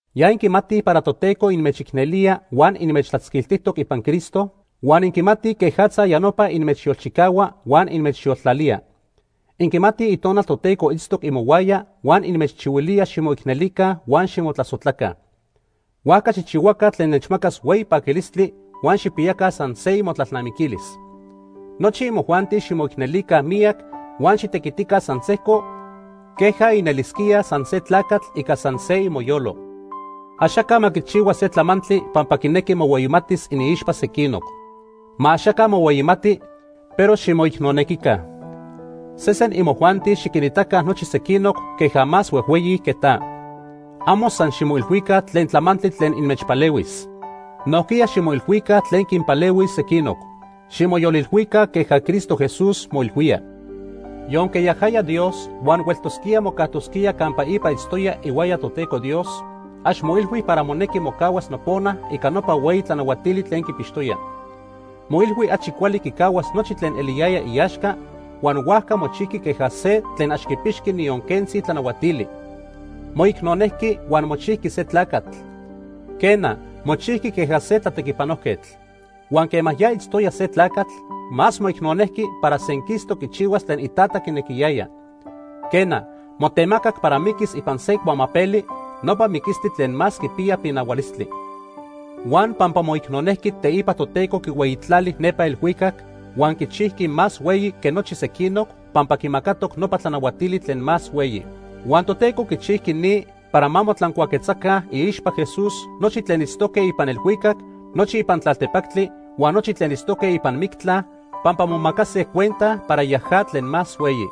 Ya inquimatij para Toteco inmechicnelía huan inmechtlatzquiltijtoc ipan Cristo, huan inquimatij quejatza ya nopa inmechyolchicahua huan inmechyoltlalía. Inquimatij Itonal Toteco itztoc imohuaya huan inmechchihuilía ximoicnelica huan ximotlasojtlaca. Huajca xijchihuaca tlen nechmacas hueyi paquilistli huan xijpiyaca san se imotlalnamiquilis. Nochi imojuanti ximoicnelica miyac huan xitequitica san sejco queja inelisquíaj san se tlacatl ica san se imoyolo. Axaca ma quichihua se tlamantli pampa quinequi mohueyimatis iniixpa sequinoc. Ma axaca mohueyimati, pero ximoicnonequica. Sesen imojuanti xiquinitaca nochi sequinoc queja más huejhueyi que ta. Amo san ximoilhuica tlen tlamantli tlen inmechpalehuis. Nojquiya ximoilhuica tlen quinpalehuis sequinoc. Ximoyolilhuica queja Cristo Jesús moilhuía: Yonque yajaya Dios huan hueltosquía mocajtosquía campa ipa itztoya ihuaya Toteco Dios, ax moilhui para monequi mocahuas nopona ica nopa hueyi tlanahuatili tlen quipixtoya. Moilhui achi cuali quicahuas nochi tlen eliyaya iaxca, huan huajca mochijqui queja se tlen ax quipixqui niyon quentzi tlanahuatili. Moicnonejqui huan mochijqui se tlacatl, quena, mochijqui queja se tlatequipanojquetl. Huan quema ya itztoya se tlacatl, más moicnonejqui para senquistoc quichihuas tlen iTata quinequiyaya. Quena, motemacac para miquis ipan se cuamapeli, nopa miquistli tlen más quipiya pinahualistli. Huan pampa moicnonejqui teipa Toteco quihueyitlali nepa elhuicac, huan quichijqui más hueyi que nochi sequinoc pampa quimacatoc nopa tlanahuatili tlen más hueyi. Huan Toteco quichijqui ni para ma motlancuaquetzaca iixpa Jesús nochi tlen itztoque ipan elhuicac, nochi ipan tlaltepactli huan nochi tlen itztoque ipan mictla pampa momacase cuenta para yaja tlen más hueyi.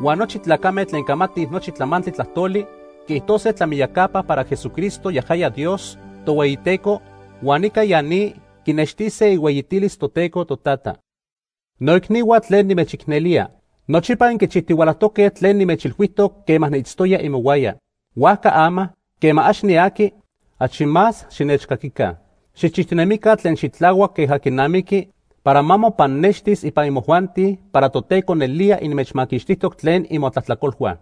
Huan nochi tlacame tlen camatij nochi tlamantli tlajtoli quiijtose tlamiyacapa para Jesucristo, yajaya Dios Tohueyiteco, huan ica ya ni quinextise ihueyitilis Toteco Totata. Noicnihua tlen nimechicnelía, nochipa inquichijtihualajtoque tlen nimechilhuijtoc quema niitztoya imohuaya. Huajca ama, quema ax niaqui, achi más xinechcaquica. Xijchijtinemica tlen xitlahuac queja quinamiqui para ma mopannextis ipan imojuanti para Toteco nelía inmechmaquixtijtoc tlen imotlajtlacolhua.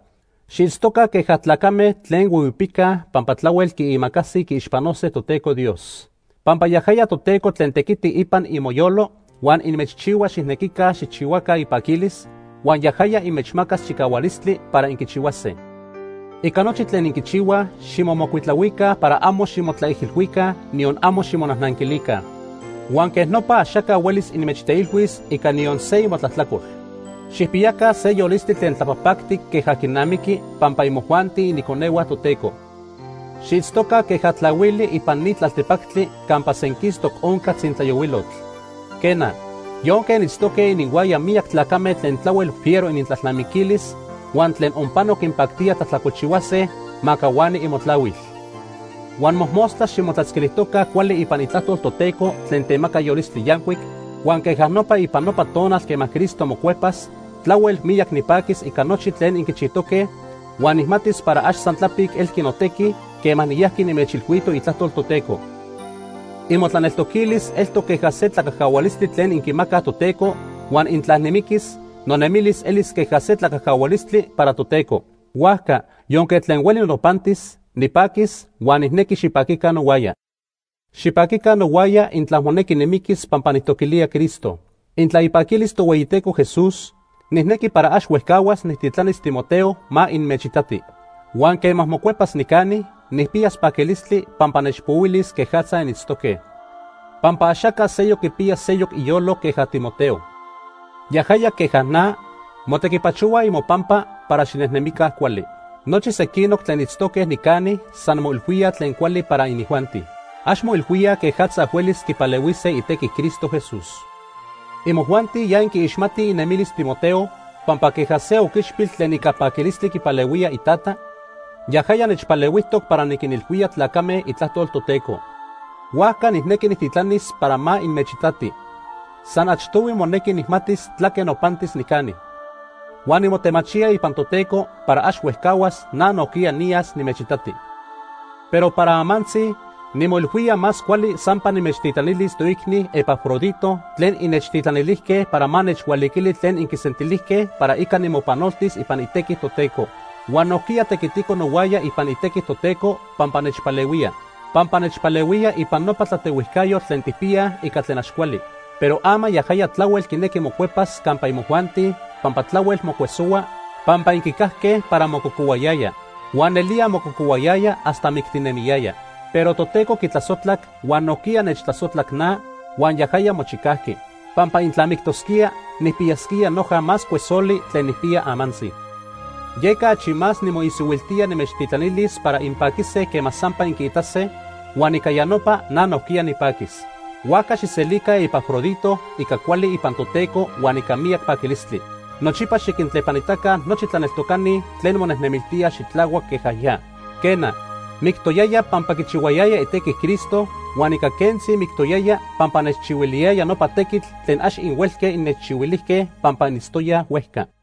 Xiitztoca queja tlacame tlen huihuipicaj pampa tlahuel quiimacasij quiixpanose Toteco Dios. Pampa yajaya Toteco tlen tequiti ipan imoyolo huan inmechchihua xijnequica xijchihuaca ipaquilis, huan yajaya inmechmacas chicahualistli para inquichihuase. Ica nochi tlen inquichihuaj ximomocuitlahuica para amo ximotlaijilhuica, niyon amo ximonajnanquilica. Huan quej nopa axaca huelis inmechteilhuis ica niyon se imotlajtlacol. Xijpiyaca se yolistli tlen tlapajpactic queja quinamiqui pampa imojuanti iniconehua Toteco. Xiitztoca queja tlahuili ipan ni tlaltepactli campa senquistoc onca tzintlayohuilotl. Quena, yonque initztoque ininhuaya miyac tlacame tlen tlahuel fiero inintlalnamiquilis huan tlen onpano quinpactía tlajtlacolchihuase ma cahuani imotlahuil. Huan mojmostla ximotlatzquilijtoca cuali ipan itlajtol Toteco tlen temaca yolistli yancuic, huan queja nopa ipan nopa tonal quema Cristo mocuepas, tlahuel miyac nipaquis ica nochi tlen inquichijtoque, huan nijmatis para ax san tlapic elqui notequi quema niyajqui nimechilhuito itlajtol Toteco. Imotlaneltoquilis eltoc queja se tlacajcahualistli tlen inquimacaj Toteco huan intla nimiquis, nonemilis elis queja se tlacajcahualistli para Toteco. Huajca yonque tlen hueli nopantis, nipaquis huan nijnequi xipaquica nohuaya. Xipaquica nohuaya intla monequi nimiquis pampa nijtoquilía Cristo. Intla ipaquilis Tohueyiteco Jesús, nijnequi para ax huejcahuas nijtitlanis Timoteo ma inmechitati. Huan quema mocuepas nicani, nijpiyas paquilistli pampa nechpohuilis quejatza initztoque. Pampa axaca seyoc quipiya se iyolo queja Timoteo. Yajaya, queja na, motequipachohua imopampa para xinejnemica cuali. Nochi sequinoc tlen itztoque nicani san moilhuíaj tlen cuali para inijuanti. Ax moilhuíaj quejatza huelis quipalehuise itequi Cristo Jesús. Imojuanti ya inquiixmatij inemilis Timoteo pampa queja se oquichpil tlen ica paquilistli quipalehuía itata, yajaya nechpalehuijtoc para niquinilhuía tlacame itlajtol Toteco. Huajca nijnequi nijtitlanis para ma inmechitati. San achtohui monequi nijmatis tlaque nopantis nicani. Huan nimotemachía ipan Toteco para ax huejcahuas na nojquiya niyas nimechitati. Pero para amantzi, nimoilhuía más cuali sampa nimechtitlanilis toicni Epafrodito tlen innechtitlanilijque para ma nechhualiquili tlen inquisentilijque para ica nimopanoltis ipan itequi Toteco. Huan nojquiya tequitico nohuaya ipan itequi Toteco, pampa nechpalehuía. Pampa nechpalehuía ipan nopa tlatehuijcayotl tlen tijpiyaj ica tlen ax cuali. Pero ama yajaya tlahuel quinequi mocuepas campa imojuanti pampa tlahuel mocuesohua pampa inquicajque para mococohuayaya. Huan nelía mococohuayaya hasta mictinemiyaya. Pero Toteco quitlasojtlac huan nojquiya nechtlasojtlac na huan yajaya mochicajqui. Pampa intla mictosquía, nijpiyasquía noja más cuesoli tlen nijpiya amantzi. Yeca achi más nimoisihuiltía nimechtitlanilis para inpaquise quema sampa inquiitase, huan ica ya nopa na nojquiya nipaquis. Huajca xijselica Epafrodito ica cuali ipan Toteco huan ica miyac paquilistli. Nochipa xiquintlepanitaca nochi tlaneltocani tlen monejnemiltíaj xitlahuac queja ya. Quena, mictoyaya pampa quichihuayaya itequi Cristo huan ica quentzi mictoyaya pampa nechchihuiliyaya nopa tequitl tlen ax inhuelque innechchihuilijque pampa initztoyaj huejca.